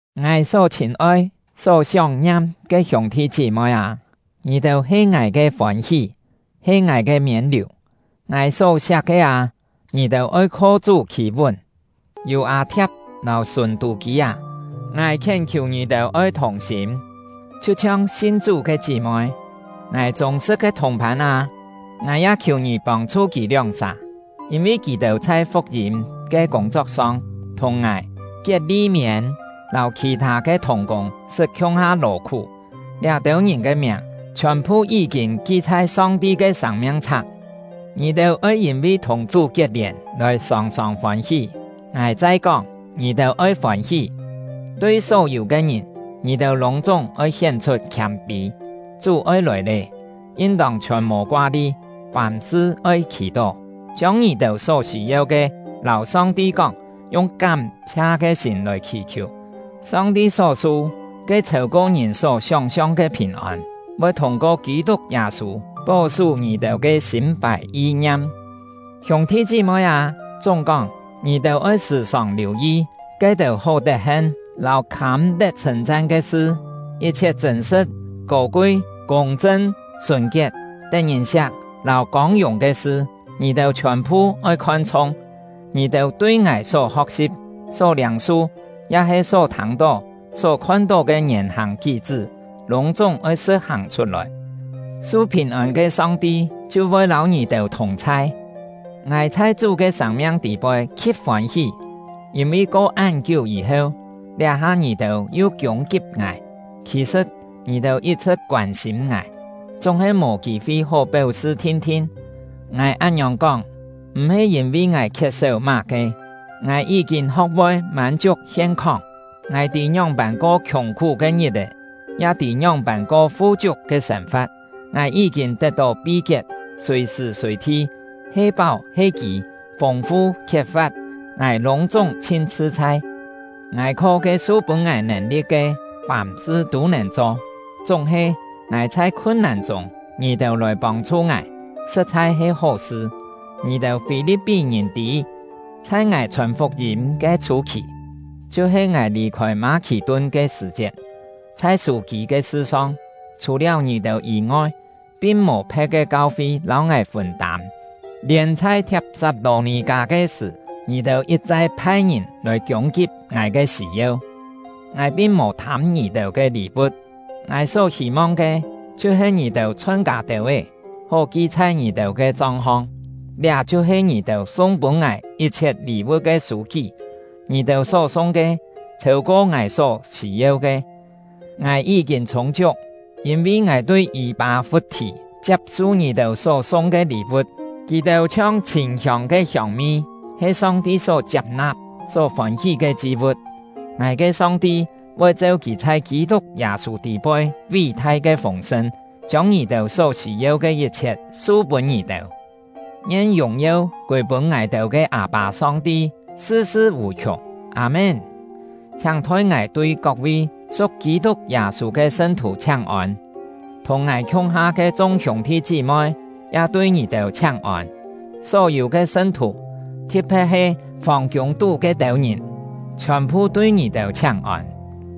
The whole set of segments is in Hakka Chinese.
Ngài só chhîn-oi, só sióng-ngiam ke hiûng-thi chí-moi â, ngì-têu he ngài ke fôn-hí, he ngài ke miên-liù! Ngài só-siak ke â, ngì-têu oi kho Chú khî-vún. Yû-â-thia̍p lâu Sùn-tû-kî â, ngài khién-khiù ngì-têu oi thùng-sîm, chhiu-chhiong sin Chú ke chí-moi. Ngài chûng-sṳ̍t ke thùng-phân â, ngài ya khiù ngì pông-chhu kì lióng-sà; yîn-vi kì-têu chhai fuk-yîm ke kûng-chok-song thùng ngài, Kiet-li-miên, lâu khì-thâ ke thùng-kûng sṳt khiung-ha lò-khú; liá-têu ngìn ke miàng chhiòn-phu yí-kîn ki chhai Song-ti ke sâng-miang-chhak. Ngì-têu oi yîn-vi thùng Chú kiet-lièn lòi sòng-sòng fôn-hí. Ngài chai kóng, ngì-têu oi fôn-hí! Tui só-yû ke ngìn, ngì-têu lûng-chúng oi hién-chhut khiâm-pî. Chú oi lòi lé. Yin-tông chhiòn mò koa-li; fàm-sṳ oi khì-tó, chiông ngì-têu só sî-yeu ke lâu Song-ti kóng, yung kám-chhia ke sîm lòi khì-khiù. Song-ti só su, ke chhêu-ko ngìn só sióng-siong ke phìn-ôn, voi thûng-ko Kî-tuk Yâ-sû pó-sú ngì-têu ke sîm-fài yi-ngiam. Hiûng-thi chí-moi â, chúng-kóng, ngì-têu oi sṳ̀-sòng liù-yi ke-têu hó tet-hen lâu khâm-tet chhṳ̂n-chan ke sṳ. Yit-chhiet chṳ̂n-sṳ̍t, kô-kui, kûng-chṳn, sùn-kiet, tet-ngìn-siak lâu kông-yùng ke sṳ, ngì-têu chhiòn-phu oi khon-chhûng. Ngì-têu tui ngài só ho̍k-si̍p, só liâng-su, ya-he só thâng-tó, só khon-tó ke ngièn-hàng kí-chṳ́, lûng-chúng oi sṳ̍t-hàng chhut-lòi. Su phìn-ôn ke Song-ti chhiu voi lâu ngì-têu thùng-chhai. Ngài chhai Chú ke sâng-miang tî-poi khi̍t fôn-hí! Yîn-vi ko án-kiú yî-heu, liá-ha ngì-têu yu kiûng-kip ngài. Khì-sṳ̍t, ngì-têu yit-chhṳ̍t koân-sîm ngài, chúng-he mò kî-fi hó péu-sṳ thin-thin. Ngài án-ngiòng kóng, m̀-he yîn-vi ngài khiet-séu má-ke; ngài yí-kîn ho̍k-voi mân-chiuk hien-khóng. Ngài tî ngióng-pân ko khiùng-khú ke ngit-è, ya tî ngióng-pân ko fu-chiuk ke sên-fa̍t. Ngài yí-kîn tet-tó pi-kiet, sùi-sṳ̀ sùi-thi, he páu he kî, fûng-fu khiet-fa̍t, ngài lûng-chúng chhin chhṳ-chhai. Ngài kho ke su-pûn ngài nèn-li̍t ke, fàm-sṳ tû nèn cho. Chúng-he, ngài chhai khun-nàn chûng, ngì-têu lòi pông-chhu ngài, sṳ̍t-chhai he hó sṳ. Ngì-têu Fî-li̍p-pí-ngìn tî, chhai ngài chhòn fuk-yîm ke chhû-khì, chhiu-he ngài lì-khôi Mâ-khì-tun ke sṳ̀-chiet, chhai sû-chṳ̂ ke sṳ-song, chhù-liáu ngì-têu yî-ngoi, pin mò phe̍t ke kau-fi lâu ngài fûn-tâm. Lièn chhai Thiap-sat-lò-nì-kâ ke sṳ̀, ngì-têu yit-chai phai-ngìn lòi kiûng-kip ngài ke sî-yeu. Ngài pin mò thâm ngì-têu ke lî-vu̍t; ngài só hî-mong ke chhiu-he ngì-têu chhon kâ têu-é, hó ki chhai ngì-têu ke chong-hong. Liá chhiu-he ngì-têu sung pûn ngài yit-chhiet lî-vu̍t ke sû-kí; ngì-têu só sung ke chhêu-ko ngài só sî-yeu ke. Ngài yí-kîn chhûng-chiuk, yîn-vi ngài tui Yî-pâ-fut-thì chiap-su ngì-têu só sung ke lî-vu̍t. Kì-têu chhiong chhîn-hiông ke hiông-mi, he Song-ti só chiap-na̍p, só fôn-hí ke chi-vu̍t. Ngài ke Song-ti voi cheu Kì chhai Kî-tuk Yâ-sû tî-poi ví-thai ke fûng-sṳn, chiông ngì-têu só sî-yeu ke yit-chhiet su-pûn ngì-têu. Ngien yùng-yeu kûi-pûn ngài-têu ke Â-pâ Song-ti, sṳ-sṳ vù-khiùng! Â-mén. Chhiáng thoi ngài tui kok-vi su̍k Kî-tuk Yâ-sû ke sṳn-thù chhiáng-ôn. Thùng ngài khiung-ha ke chung hiûng-thi chí-moi ya tui ngì-têu chhiáng-ôn. Só-yû ke sṳn-thù, thi̍t-phe̍t he fòng-kiûng-tú ke-têu ngìn, chhiòn-phu tui ngì-têu chhiáng-ôn.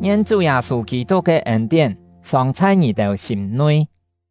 Ngien Chú Yâ-sû Kî-tuk ke ên-tién sòng chhai ngì-têu sîm-nui!